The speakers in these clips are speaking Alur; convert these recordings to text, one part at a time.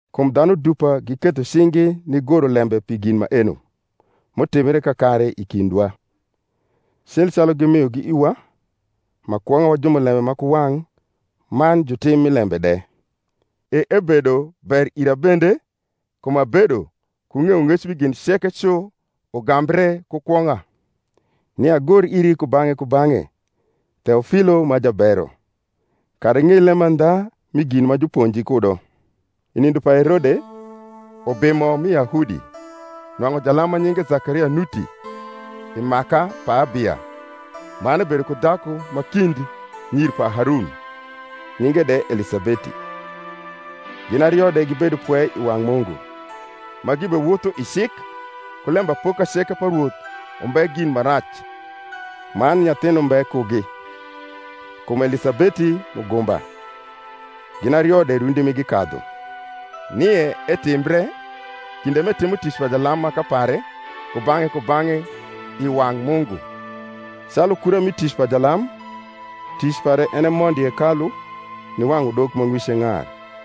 Kum dhanu dupa giketho cing’gi nigoro lembe pi gin maeno m’utimbre kakare i kindwa, cil calu gimiogi iwa, ma kwong’a wa jumulembe ma ku wang’ man jutim mi lembe de, e ebedo ber ira bende, kum abedo ku ng’eyong’ec mi gin ceke cu ugambre ku kwong’a, nia agor iri kubang’e kubang’e, Theofiio ma jabero; kara ing’ei lemandha mi gin ma juponji kudo. I nindo pa Herode, ubimo mi Yahudi, nwang’u jalam ma nyinge Zakaria nuti, i maka pa Abia: man ebedo ku dhaku ma kind nyir pa Harun, nyinge de Elisabeti. Gin ario de gibedo pwe i wang’ Mungu, ma gibewotho i cik ku lembapoka ceke pa Rwoth umbe gin ma rac. Man nyathin umbe kugi, kum Elisabeti mugumba, gin ario de rundi migi kadhu. Nie etimbre, kinde m’etimo tic pa jalam maka pare kubang’e kubang’e i wang’ Mungu, calu kura mi tic pa jalam, tic pare en e mondo i hekaiu niwang’u udok ma ng’wice ng’ar.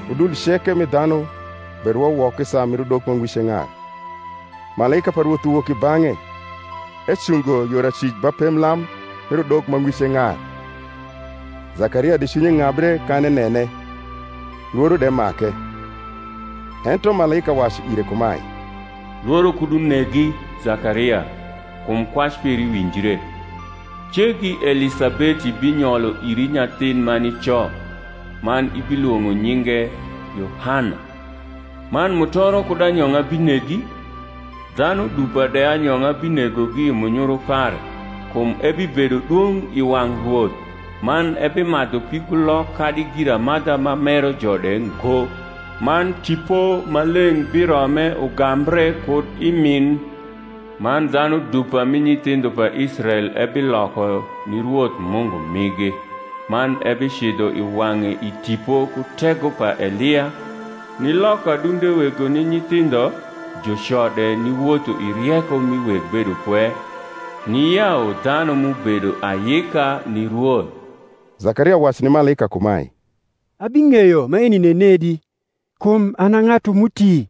Udul ceke mi dhanu berwo woko i saa mir udok ma ng’wice ng’ar. Malaika pa Rwoth uwok i bang’e ecungo yor acwic ba pemblam mir udok ma ng’wice ng’ar. Zakaria de cwinye ng’abre kan enene, lworo de make. Ento malaika wacu ire kumae, Lworo kud unegi, Zakaria: kum kwac peri winjre, cegi Elisabeti binyolo iri nyathin ma nico, man ibilwong’o nyinge Yohana. Man mutoro kud anyong’a binegi; dhanu dupa de anyong’a binegogi i munyuru pare. Kum ebibedo dwong’ i wang’ Rwoth, man ebimadhu pigulok kadi giramadha ma mero jo de ngo; man Tipo Maleng’ birome, ugambre kud i min. Man dhanu dupa mi nyithindho pa Israel ebiloko ni Rwoth Mungu migi. Man ebicidho i wang’e i tipo ku tego pa Elia, niloko adunde wego ni nyithindho, juco de niwotho i rieko mi weg bedopwe; niyau dhanu m’ubedo ayika ni Rwoth. Zakaria wacu ni malaika kumae, Abing’eyo maeni nenedi? kum an a ng’atu m’uti,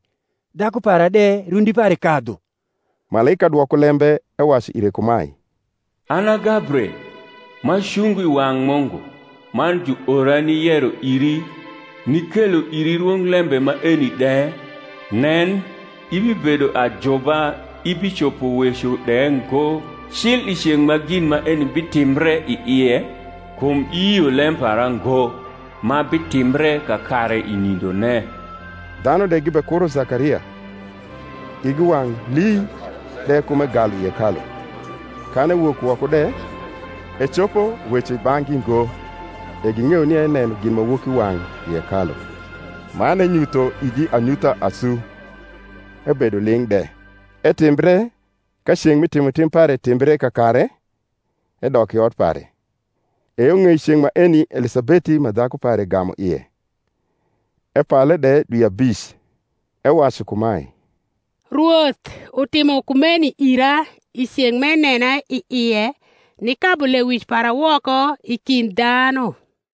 dhaku para de rundr pare kadhu. Malaika dwoko lembe ewacu ire kumae, An a Gabriel, ma cungo i wang’ Mungu; man juora niyero iri, nikelo iri rwonglembe maeni de. Nen, ibibedo ajuba ibicopo weco de ngo, cil i ceng’ ma gin maeni bitimbre i ie, kum iyio lem para ngo, ma bitimbre kakare i nindone. Dhanu de gibekuro Zakaria, igi wang’ hi de kum egalu i hekalu. Kan ewok woko de, ecopo weco i bang’gi ngo: e ging’eyo nia eneno ginmawokiwang’ i hekalu: man enyutho igi anyutha asu, ebedo ling’ de. Etimbre ka ceng’ mi timotim pare timbre kakare, edok i ot pare. E yo ng’ei ceng’ maeni Elisabeti ma dhaku pare gamu ie; epale de dwi abic, ewacu kumae, Rwoth utimo kumeno ira i ceng’ m’enena i ie, nikabu lewic para woko i kind dhanu.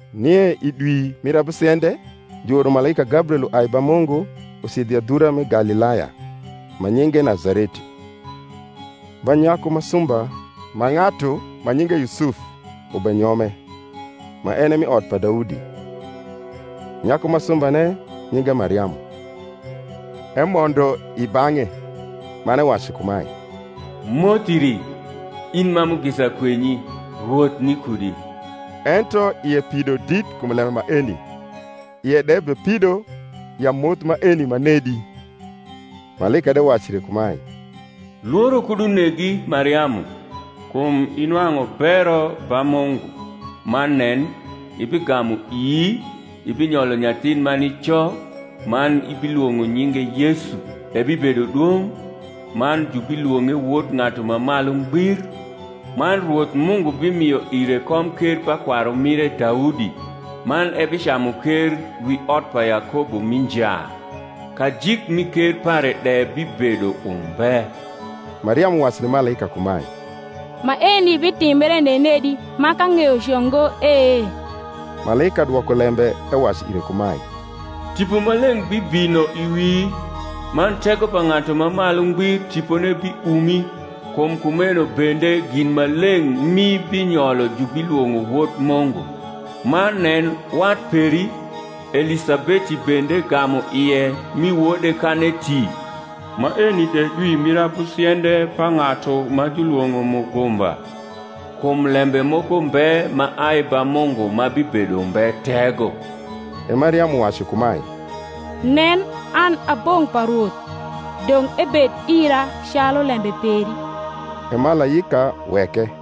Nie i dwi mir abusiende juoro malaika Gabriel uai ba Mungu ucidho i adhura mi Galilaya, ma nyinge Nazareti, ba nyaku ma sumba ma ng’atu ma nyinge Yusuf ubenyome, ma en e mi ot pa Daudi; nyaku ma sumbane nyinge Mariamu. Emondo i bang’e, man ewacu kumae, Moth iri, in ma mugisa kwenyi, Rwoth ni kudi. Ento ie pido dit kum lembe maeni, ie de bepido ya moth maeni manedi. Malaika de wacu ire kumae, Lworo kud unegi, Mariamu: kum inwang’u bero ba Mungu. Man nen, ibigamu ii, ibinyolo nyathin ma nico, man ibilwong’o nyinge Yesu. Ebibedo dwong’, man jubilwong’e Wod Ng’atu ma Malu Ngbir: man Rwoth Mungu bimio ire komker pa kwarumire Daudi. man ebicamu ker wi ot pa Yakobo mi nja; kajik mi ker pare de bibedo umbe. Mariamu wacu ni malaika kumae, Maeni bitimbre nenedi, ma k’ang’eyo co ngo e? Malaika dwoko lembe ewacu ire kumae, Tipo Maleng’ bibino i wii, man tego pa Ng’atu ma Malu Ngbir tipone biumi: kum kumeno bende gin maleng’ m’ibinyolo jubilwong’o Wod Mungu. Man nen, wat peri, Elisabeti bende gamu ie mi wode kan eti; maeni de dwi mir abusiende pa ng’atu ma julwong’o mugumba. Kum lembe moko mbe ma ai ba Mungu ma bibedo umbe tego. E Mariamu wacu kumae, Nen, an a bong’ pa Rwoth; dong’ ebed ira calu lembe peri. E malaika weke.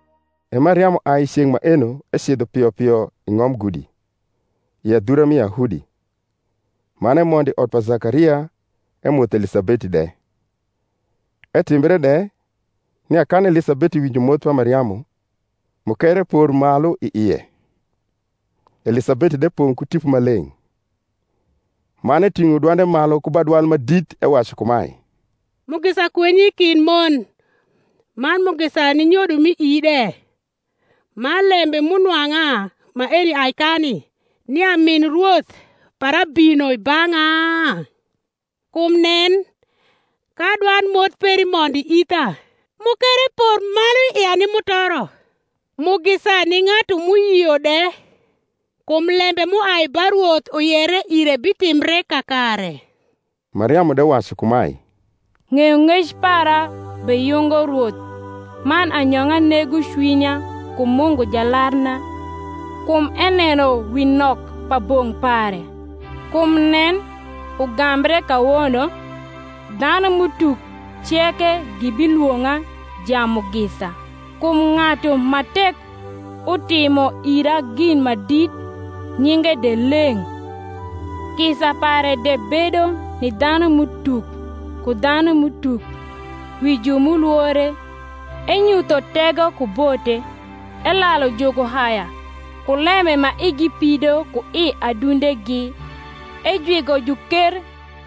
E Mariamu ai i ceng’ maeno ecidho pio pio i ng’om gudi, i adhura mi Yahudi; man emondo i ot pa Zakaria emotho Elisabeti de. Etimbre de, nia kan Elisabeti winjo moth pa Mariamu, mukere por malu i ie; Elisabeti de pong’ ku Tipo Maleng’; man eting’o dwande malu ku ba dwal ma dit, ewacu kumae, Mugisa kwenyi kind mon, man mugisa ni nyodo m’i ii de. Man lembe m’unwang’a maeni ai kani, nia min Rwoth para bino i bang’a? Kum nen, ka dwand moth peri mondo i itha, mukere por malu i ia ni mutoro. Mugisa ni ng’atu m’uyio de; kum lembe m’uai ba Rwoth uyere ire bitimhie kakare. Mariamu de wacu kumae, Ng’eyong’ec para beyungo Rwoth, Man anyong’a nego cwinya kum Mu ngu Jalarna. Kum eneno wi nok pa bong’ pare: Kum nen, ugambre kawono dhanum’ utuk ceke gibilwong’a jamugisa. Kum ng’atu ma tek utimo ira gin ma dit; Nyinge de leng’. Kisa pare de bedo ni dhanum’utuk ku dhanum’utuk Wi ju m’ulwore. Enyutho tego ku bote; Elalu jukuhaya ku lembe ma igi pido ku i adundegi. Ejwigo juker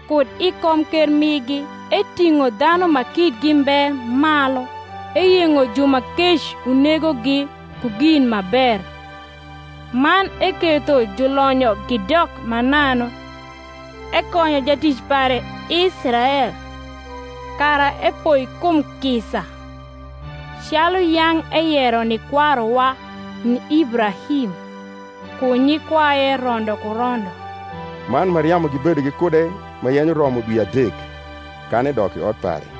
kud i komker migi, Eting’o dhanu ma kitgi mbe malu. Eyeng’o ju ma kec unegogi ku gin ma ber; Man eketho julonyo gidok mananu. Ekonyo jatic pare Israel, Kara epoi kum kisa (Calu yang’ eyero ni kwaruwa) Ni Ibrahim ku nyikwaye rondo ku rondo. Man Mariamu gibedo gikude ma yenyo romo dwi adek, kan edok i ot pare.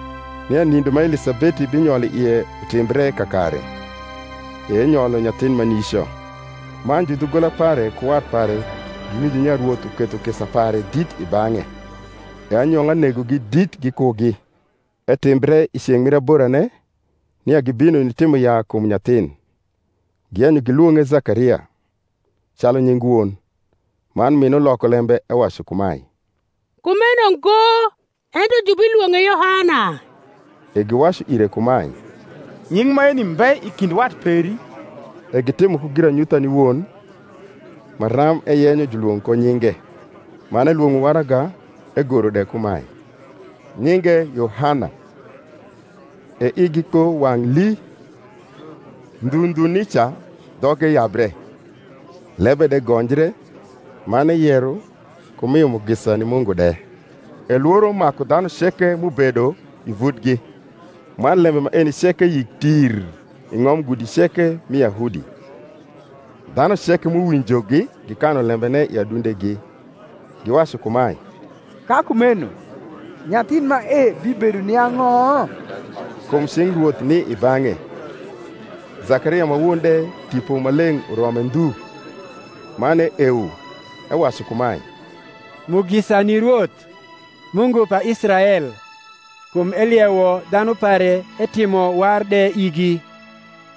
Nie nindo ma Elisabeti binyol i ie utimbre kakare: e enyolo nyathin ma nico. Man judhugola pare ku wat pare giwinjo nia Rwoth uketho kisa pare dit i bang’e; e anyong’a negogi dit gikugi. Etimbre i ceng’ mu aborane, nia gibino nitimo yaa kum nyathin; giyenyo gilwong’e Zakaria, calu nying won. Man min uloko lembe ewacu kumae, Kumeno ngo; ento jubilwong’e Yohana. E giwacu ire kumae, Nying’ maeni mbe i kind wat peri. E gitimo ku giranyutha ni won, maram eyenyo julwong’ ko nyinge. Man elwong’o waraga, egoro de kumae. Nyinge Yohana. E igi kpo wang’ lii. Ndhu ndhu nica dhoge yabre, lebe de gonjre, man eyero, ku mio mugisa ni Mungu de. E lworo maku dhanu ceke m’ubedo i vutgi: man lembe maeni ceke yik tir i ng’om gudi ceke mi Yahudi. Dhanu ceke m’uwinjogi gikanu lembene i adundegi, giwacu kumae, Ka kumeno nyathin mae bibedo ni ang’o? Kum cing Rwoth ni i bang’e. Zakaria ma won de Tipo Maleng’ urome ndhu, man eewo, ewacu kumae, Mugisa ni Rwoth, Mungu pa Israel; Kum eliewo dhanu pare etimo war de igi,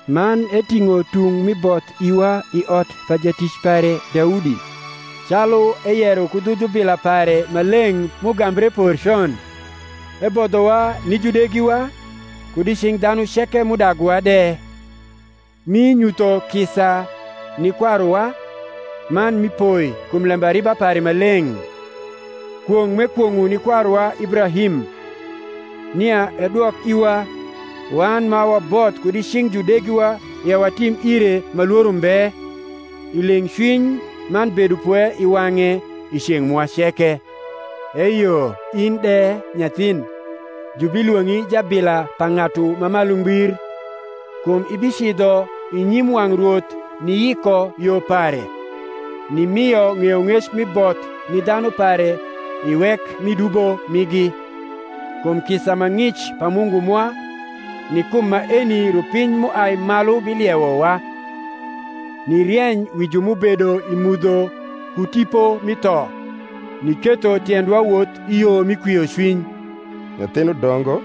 Man eting’o tung mi both rwa I ot pa jatic pare Daudi (Calu eyero ku dhu jubila pare ma leng’ m’ugambre por con), Ebodhowa ni judegiwa, kud i cing’ dhanu ceke m’udaguwa de; Mi nyutho kisa ni kwaruwa, Man mi poi kum lembariba pare ma leng’; Kwong’ m’ekwong’o ni kwaruwa Ibra him, Nia edwok iwa, wan ma waboth kud I cing’ judegiwa Ya watim ire ma lworo mbe, I leng’cwiny man bedopwe i wang’e I ceng’ mwa ceke. Eyo in de, nyathin, jubilwong’i jabila pa Ng’atu ma Malu Ngbir: Kum ibicidho i nyim wang’ Rwoth niyiko yo pare; Nimio ng’eyong’ec mi both ni dhanu pare I wek mi dubo migi, Kum kisa ma ng’ic pa Mungu mwa, Ni kum maeni rupiny m’uai malu biliewowa, Nirieny wi ju m’ubedo i mudho ku tipo mi tho; Niketho tiendwa woth i yo mi kwiocwiny. Nyathin udongo,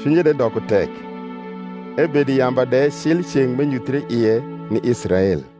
cwinye de doko tek, ebedo i yamba de cil i ceng’ m’enyuthre ie ni Israel.